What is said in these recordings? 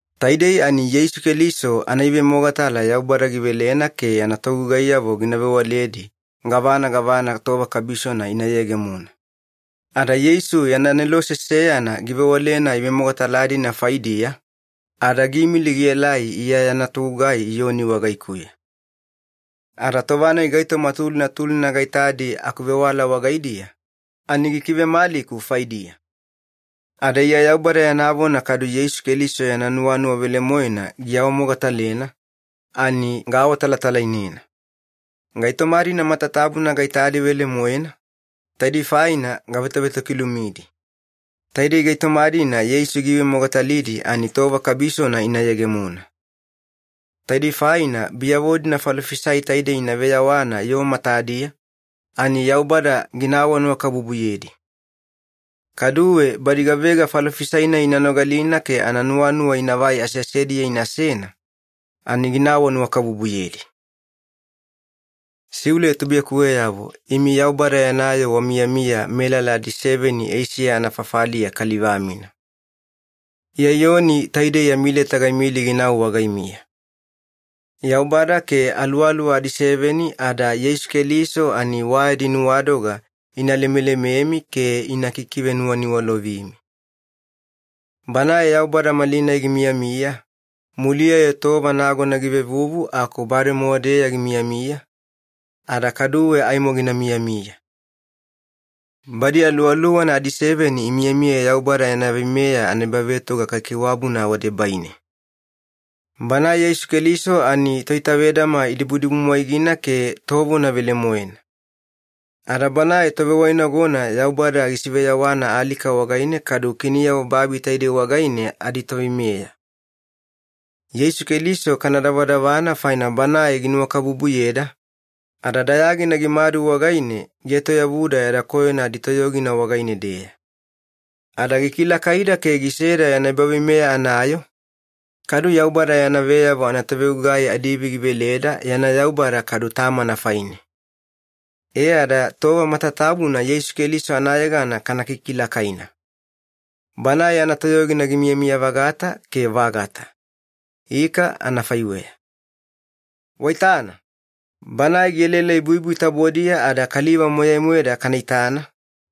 Taidei ani Yeisu Keliso anaivemogatala Yaubada givelena ke yana togugaiyavo gina vewaledi gavana gavana tova kabisona ina yegemona. Ada Yeisu yana anelose seyana givewalena ivemogatala-dina faidiya, ada giimili gielai Iya yana togugai Iyoni wagaikuya. Ada tova-nai gaitoma tulina tulina gaitadi akuvewala wagaidiya, ani gikivemaliku faidiya. Ada Iya Yaubada yana vona kadu Yeisu Keliso yana nuwanuwa velemoena giawamogatalena, ani gaawatalatalainena. Gaitoma-dina matatabuna gaitadi velemoena, taidei faina gavetovetokilumidi. Taidei gaitoma-dina Yeisu giivemogatalidi ani tova kabisona ina yegemona. Taidei faina biyavo-dina falofisai taidei ina veyawana yoo matadiya, ani Yaubada gina awanuwakabubuyedi. Kaduwe badi gavega falofisai-nai ina nogalina ke ananuwanuwa inavai aseasediya inasena, ani gina awanuwakabubuyedi. Siule tubuiyakuweyavo imi Yaubada yana yoo wamiyamiya melala adiseveni Eisiya anafafaliya kaliva-mina. Iya Iyoni taidei yami leta gaimili ginau wagaimiya. Yaubada ke Aluwaluwa adiseveni ada Yeisu Keliso ani wa yadi nuwadoga ina lemelememi ke ina kikivenuwaniwalovimi. Banae Yaubada malinai gimiyamiya, muliya-yo tova nagona givevuvu aku bademowa-deya gimiyamiya, ada kaduwe aimo gina miyamiya. Badi aluwaluwana adiseveni imiyamiya Yaubada yana veimeya anaebavetoga kaikaiwabuna wadebaine. Banae Yeisu Keliso ani toitavedama idibudibumwaigina ke tovona velemoena. Ada Banae tovewainagona Yaubada gisiveyawana alika wagaine kadu kiniyavo babi taidei wagaine aditoveimeya. Yeisu Keliso kana davadavana faina Banae ginuwakabubuyeda, ada dayagina gimadu wagaine gietoyavuda yada koyona aditoyogina wagaine-deya. Ada gikilakaida ke giseda yana ebaveimeya anayoo, kadu Yaubada yana veyavo anatovegugai adiivi giveleda yana Yaubada kadu Tamana faine. E ada tova matatabuna Yeisu Keliso anayegana kana kikilakaina. Banae yana toyogina gimiyamiya-vagata ke vagata. Ika anafaiweya. Waitana, Banae gielaelai buibui tabodiya ada kaliva moyai-moeda kana itana,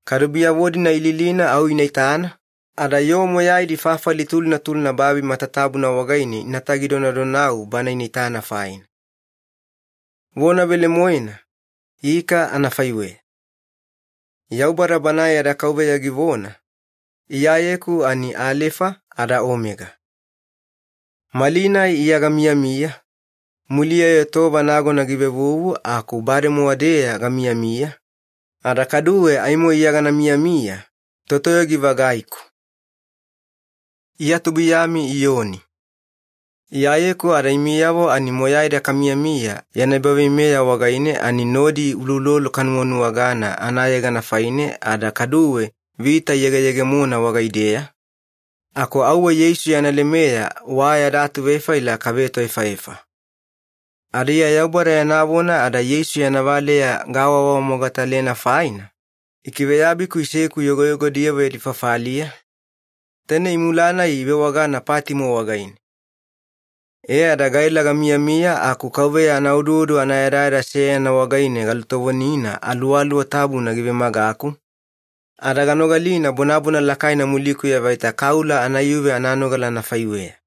kadu biyavo-dina ililina au ina itana, ada yoo moyaidi fafali tulina tulina babi matatabuna wagaine inatagi donadonau Bana ina itana faina. Vona velemoena, ika anafaiweya. Yaubada Banae yada Kauveya givona, “Iyayeku ani Alefa ada Omega. Malinai Iya gamiyamiya, muliya-yo tova nagona givevuvu aku bademowa-deya gamiyamiya, ada kaduwe aimo Iya gana miyamiya, Totoyogi-vagaiku.” Iya tubuiyami Iyoni. Iyayeku ada imiyavo ani moyaida kamiyamiya yana ebaveimeya wagaine ani nodi uloulolo kanuwanuwagana anayegana faine ada kaduwe vita iyegeyegemona wagaideya, aku auwe Yeisu yana lemeya wa yada atuvefaila kavetoefaefa. Ada Iya Yaubada yana vona ada Yeisu yana valeya gaawawamogatalena faina, ikiveyabiku iseku yogoyogodiyavo yadi fafaliya, taine imula-nai ivewagana Patimo wagaine. E ada gaela gamiyamiya aku Kauveya anaoduodu anayadayada seyana wagaine galutovonina Aluwaluwa Tabuna givemagaku, ada ganogalina bonabona lakaina mulikuya vaita kaula anaiyuve ananogala anafaiweya.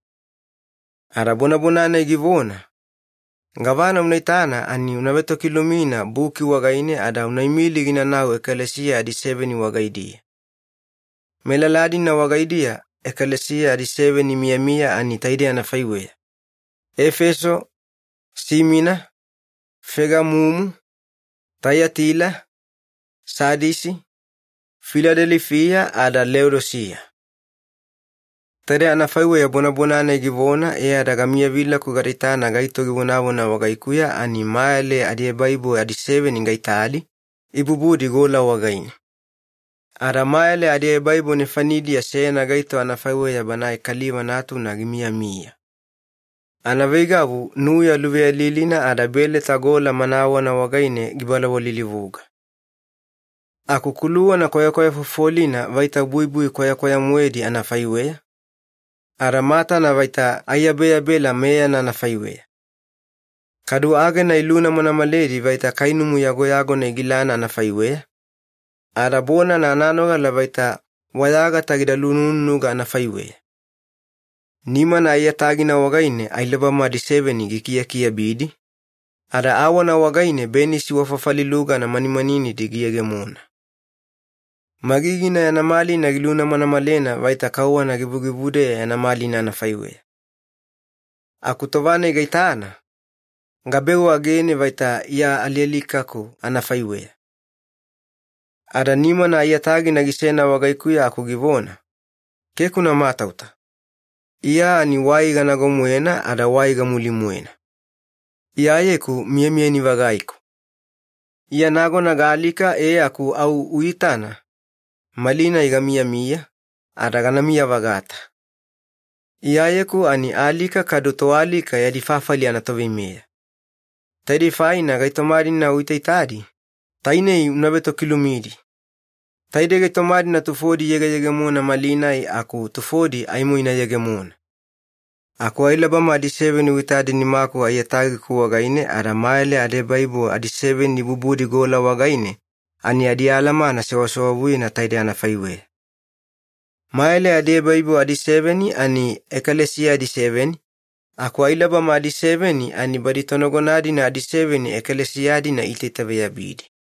Ada bonabona-nai givona, “Gavana una itana ani una vetokilumina buki wagaine ada una imili ginanau ekalesiya adiseveni wagaidiya. Melala-dina wagaidiya ekalesiya adiseveni imiyamiya ani taidei anafaiweya. Efeso, Simina, Fegamumu, Taiyatila, Sadisi, Filadelifiya ada Leodisiya.” Taide anafaiweya bonabona-nai givona e ada gamiyavilaku gada itana gaito givonavona wagaikuya ani mayale adiebaibo adiseveni gaitadi, ibubudi gola wagaine. Ada mayale adiebaibo nefanidiya seyana gaito anafaiweya Banae Kaliva Natuna gimiyamiya. Anaveigavu nuya luveyalilina ada beleta gola manawana wagaine gibalawalilivuga. Aku kuluwana kwayakwaya fofolina vaita buibui kwayakwaya-moedi anafaiweya, ada matana vaita aiyabeyabela meyana anafaiweya. Kadu agena ilunamanamaledi vaita kainumu yagoyagona igilana anafaiweya, ada bonana ananogala vaita wayagata gida lunununuga anafaiweya. Nimana aiyatagina wagaine ailabama adiseveni gikiakiabidi, ada awana wagaine benisi wa fafali lugana manimaninidi giyegemona. Magigina yana malina gilunamanamalena vaita kauwana givugivudeya yana malina anafaiweya. Aku tova-nai gaitana, gabeu agene vaita Iya alialikaku anafaiweya. Ada nimana aiyatagina gisena wagaikuya aku givona, “Keke una matauta. Iya ani wai ganago-moena ada wai gamuli-moena. Iyayeku miyamiyani-vagaiku. Iya nagona gaalika e aku au uitana, malinai gamiyamiya, ada ganamiya-vagata. Iyayeku ani Alika kadu Toalika Yadi Fafali anatoveimeya. Taidei faina gaitoma-dina uitaitadi, tainei una vetokilumidi. Taidei gaitoma-dina tufodi iyegeyegemona malinai, aku tufodi aimo ina yegemona. Aku ailabama adiseveni uitadi nimaku aiyatagiku wagaine ada mayale adiebaibo adiseveni ibubudi gola wagaine, ani adialamana sewasewavuyena taidei anafaiweya. Mayale adiebaibo adiseveni ani ekalesiya adiseveni, aku ailabama adiseveni ani badi tonagona-dina adiseveni ekalesiya-dina iitaitaveyabidi.”